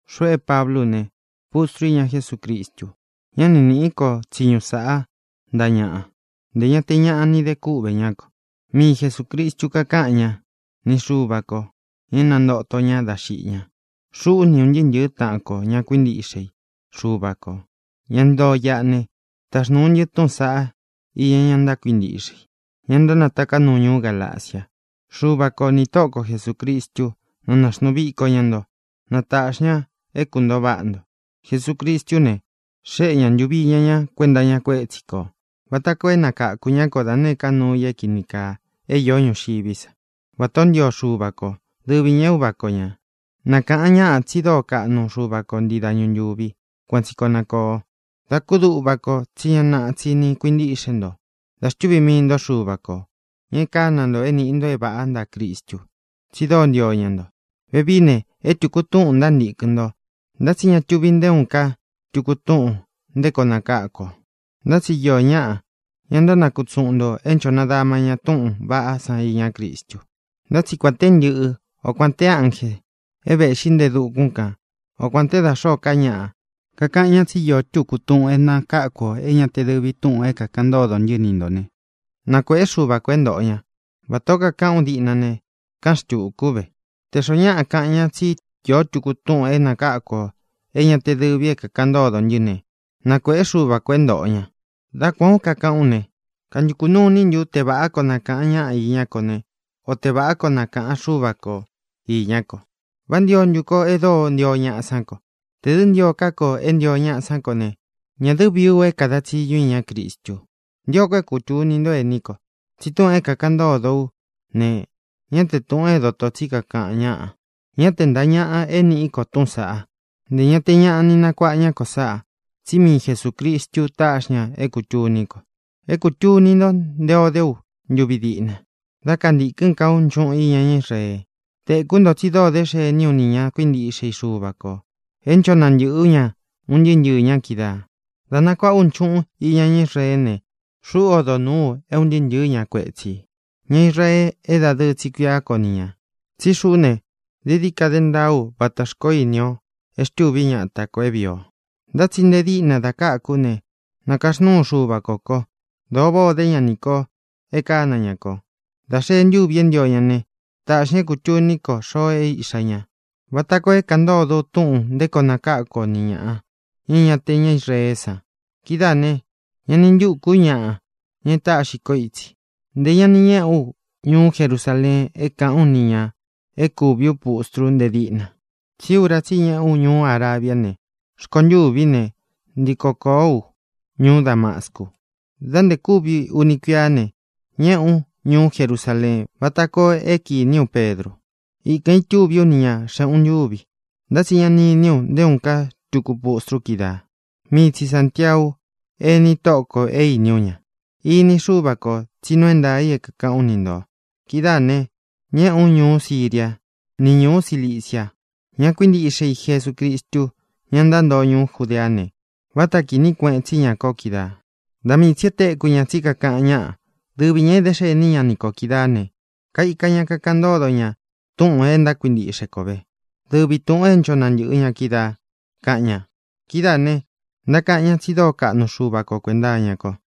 Xuꞌu é Pablú u ne, pustrú u iña Jesúcristu. Ñá ni nīꞌí ko tsiñu sāꞌá ntaꞌa ñaꞌa, ntē ña te ñaꞌa ni de kúꞌvē ñá ko. Mii Jesūcristu kakáꞌan ñá, ni Xuva kō, ña é nantōto ña dá xiꞌi ña. Xuꞌú, ni ūn ntɨɨ́ ntɨ̄ɨ́ taꞌan ko, ña kuíntiꞌxe i Xuva kō, ña ntoo iꞌa ne, taxnūu ntɨ́ tutú saꞌa iña ña kuíntiꞌxe i, ña ntánataká nuu ñuú Galacia. Xuva ko nī Tóꞌo ko Jesūcristú, na nāxnuu viko ña ntó, na tāꞌxi ña é kuntōo váꞌa nto. Jesucristú ne, xéꞌe ña ntūvi iña ña kuenta iña kuétsi kō vata koo é nakākú ña ko da nēé ka nuu i é kīni kaa é īó ñuxiví sa, vatā ó ntio Xuva ko, dɨvi ñā é Uva ko ñā. Na kāꞌan ñáꞌa tsi dóo kaꞌnu Xuva ko ntii dañu ntūvi. Kuan tsi koo na kōo. Da kúduꞌva ko tsí ña naꞌa tsi ni kuintíꞌxe nto da xtúvī mii nto Xuva ko, ña e kána nto é nīꞌi nto é vāꞌá ntaꞌa Cristu, tsi dóo ntio ña nto. Vevií ne, é tūku túꞌūn ntántīkɨn nto. Ntá tsi ña tuvi nté uun ká tuku túꞌūn nté koo nakáku ō. Ntá tsi iō ñáꞌa, ña ntánakutsuꞌun ntō é ncho nadama ña túꞌūn vaꞌá san iñá Cristu. Ntá tsi kuān té ntɨꞌɨ́, o kuān te ánjē é vēꞌxí nte e dukún kān, o kuān te dá xōó ka ñaꞌa kakaꞌan ñá tsi íō túku túꞌūn é nakáku ō é ñā te dɨvi túꞌūn é kākaꞌan ntódo ntɨ́ ni ntō né, na kuēꞌé Xuva kō é ntōꞌo ña. Vatā ó kakaꞌán u diꞌna ne, káꞌan xtūku ú ve: Tē xoó ñaꞌa kaꞌan ña tsí īó tuku túꞌūn é nakáku ō é ñā te dɨ́vi é kākaꞌan ntódo ntɨ́ ne, na kuēꞌé Xuva kō é ntōꞌo ña. Dá kuān ó kakaꞌán u ne, ¿kantūku nuu iní ntu u te vāꞌá koo na kāꞌan ñáꞌa iñá ko ne, o te vāꞌá koo na kāꞌan Xúva ko īñá ko? ¿Vá ntio ntu ko e dóo ntio ñaꞌa sán ko? Tē dɨ́ ntio ká ko é ntio ñaꞌa sán ko ne, ñā dɨ́ vií u é kāda tsiñu ú iñá Cristu. Ntio ko é kūtuni ntó, ēní ko, tsi túꞌūn é kākaꞌan ntódo ú ne, ñá te tūꞌun é dotō tsí kakaꞌan ñáꞌa. Ñá te ntāꞌa ñaꞌa é nīꞌí ko túꞌūn san. Nté ñāꞌa ña ni nakuaꞌa ñá ko sáꞌā, tsí mii Jesūcristu táꞌxi ña é kūtuní ko. É kūtuni nto nté ō dé u ntuvi diꞌna, dá kantīkɨ́n ka ú nchuꞌun iña ñá Israee. Tēkú nto tsi dóo dé xení u nī ña kuíntiꞌxe i Xuva kō, é ncho nantɨꞌɨ̄ ú ña un ntɨɨ́ ntɨɨ̄ ña kídaā. Dā nakuaꞌá u nchuꞌun iña ñá Israeé ne, xuꞌú odo nūú u é ūn ntɨɨ́ ntɨ̄ɨ́ ña kuetsī, ña Israee é dadɨɨ tsi kuiá ko ni ñā. Tsí xuꞌú ne, dií dií ka dé ntaá u vata xkoó ini o e xtúvi ñata kō é vīi o. Ntá tsi nte díꞌnā da káku ú ne, nākaxnúu Xuva kō ko. Dōo váꞌā o dé ña nī ko e kána ña ko. Dā xee ntúvī é ntio ñá ne, taꞌxī ña é kūtuní ko xoo é Iꞌxā ñá, vata koo é kāꞌan ntódo u túꞌūn nté koo nakáku o ni ñāꞌa, ña é ña te ña Israeé san. Kidáā ne, ñá ni ntūku ú ñaꞌa, ña é tāꞌxi kó itsi. Ntē ña ni ñéꞌē ú ñuú Jerusaleen é kāꞌán u nī ña e kúvi pustru nte díꞌna, tsí ura tsí i ñeꞌé u ñuú Arabia ne, rkontûví ne, ntiko kōó u ñuú Damascu. Dá ntē kúvi uni kuiá ne, ñēꞌé u ñuú Jerusaleén vata koo é kīní u Pedru. Ikān itúvī ú ni ñā xeꞌun ntúvi. Ntá tsi ña ni iní u nté uun ká tuku pustru kídaa, mii tsi Sāntiau, eni Tóꞌo kō, é īní u ña. Ini Xúva kō tsi nuu é ntaā i é kākaꞌán u ni ntō. Kidáā ne, ñéꞌē ú ñuú Siria ni ñuú Cilicia. Ña kuíntiꞌxe i Jesucristu, ña ntántoo ñuú Judeá ne, váta kīní kueꞌen tsi ñá ko kídaā. Da mii tsī e téku ña tsí kākaꞌan ñáꞌa: “Dɨvi ñā é dé xení ña ni kō kídaā ne, kaika ña kakaꞌan ntódo ña túꞌūn e ntákuintiꞌxe ko vē, dɨvi tūꞌun é ncho nantɨ̄ꞌɨ ña kídaā”, kaꞌan ña. Kidáā ne, ntákaꞌan ñá tsi dóo kaꞌnu Xuva ko kuēnta iñá ko.